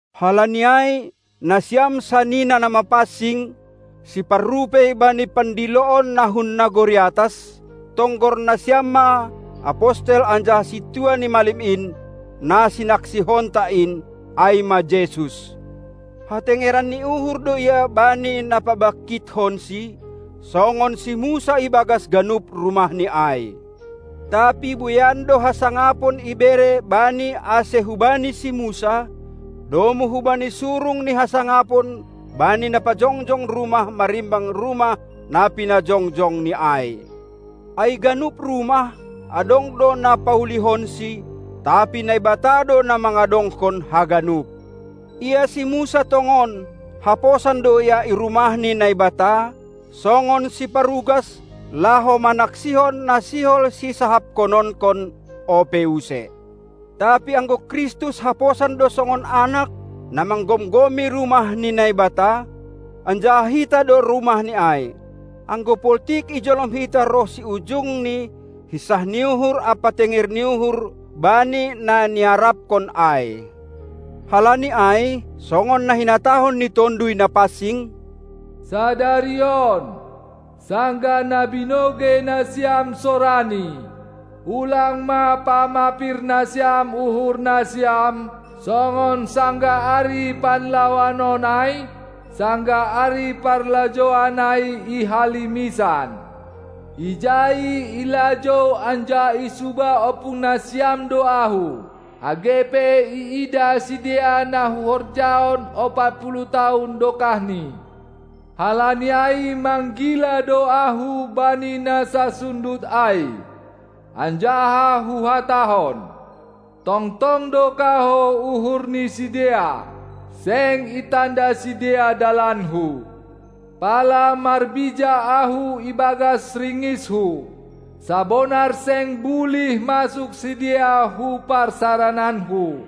Halani ai, nasiam sanina na mapansing, siparrupei bani pandiloon na hun nagori atas, tonggor nasiam ma Apostel anjaha Sintua ni malim in, na sinaksihonta in, ai ma Jesus. Hatengeran ni uhur do Ia bani na pabangkithonSi, songon si Musa ibagas ganup rumahNi ai. Tapi bueian do hasangapon ibere Bani ase hubani si Musa, domu hubani surung ni hasangapon bani na pajongjong rumah marimbang rumah na pinajongjongni ai. Ai ganup rumah, adong do na paulihonsi, tapi Naibata do na mangadongkon haganup. Ia si Musa tongon, haposan do ia i Rumah ni Naibata, songon siparugas, laho manaksihon na sihol sisahaphononkon ope use, tapi anggo Kristus haposan do songon Anak, na manggomgomi Rumah ni Naibata; anjaha hita do rumahNi ai, anggo poltik ijolom hita ronsi ujungni hinsah ni uhur ampa tenger ni uhur bani na niaraphon ai. Halani ai, songon na hinatahon ni Tonduy Napansing: "Sadari on, sanggah na binogei nasiam sorani, ulang ma pamapir nasiam uhur nasiam, songon sanggah ari panlawan on ai, sanggah ari parlajouan ai i halimisan. Ijai ilajou anjaha isuba ompung nasiam do Ahu, age pe iidah sidea na Huhorjahon ompat puluh tahun dokahni. Halani ai manggila do Ahu bani na sasundut ai, anjaha huhatahon: Tongtong do kahou uhur ni sidea, seng itanda sidea dalanKu, pala marbija Ahu ibagas ringisHu: Sabonar seng bulih masuk sidea hu parsarananKu".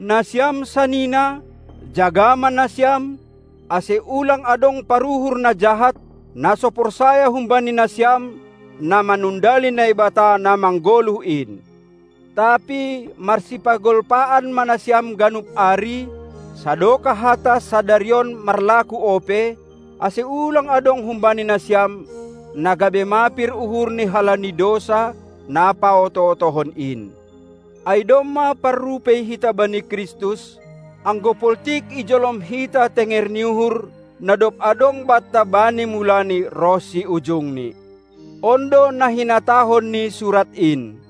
Nasiam sanina, jaga ma nasiam, ase ulang adong paruhur na jahat, na so porsaya humbani nasiam, na manundali Naibata na manggoluh in. Tapi marsipagolpaan ma nasiam ganup ari, sadokah hata "Sadari on" marlaku ope, ase ulang adong humbani nasiam, na gabe mapir uhurni halani dousa, na paoto-otohon in. Ai domma parrupei hita bani Kristus, anggo poltik ijolom hita tenger ni uhur, na dob adong banta bani mulani ronsi ujungni. On do na hinatahon ni Surat in: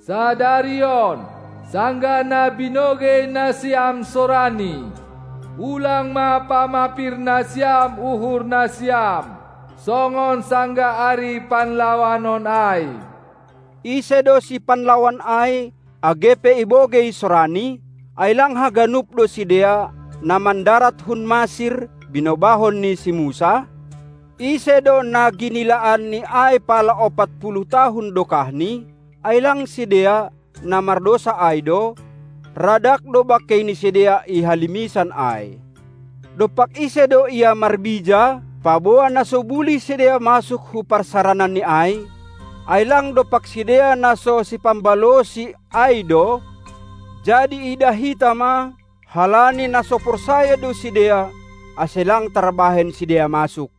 Sadari on, sanggah na binogei nasiam sorani, ulang ma pamapir nasiam uhur nasiam, songon sanggah ari panlawanon ai. Ise do sipanlawan ai, age pe ibogei sorani? Ai lang haganup do sidea, na mandarat hun Masir, binobahon ni si Musa? Ise do na ginilaanNi ai pala ompat puluh tahun dokahni? Ai lang sidea, na mardousa ai do? Radag do bangkei ni sidea i halimisan ai. Dompak ise do Ia marbija, paboa na so bulih sidea masuk hu parsarananNi ai? Ai lang dompak sidea na so si pambalosi ai do? Jadi iidah hita ma: Halani na so porsaya do sidea, ase lang tarbahen sidea masuk.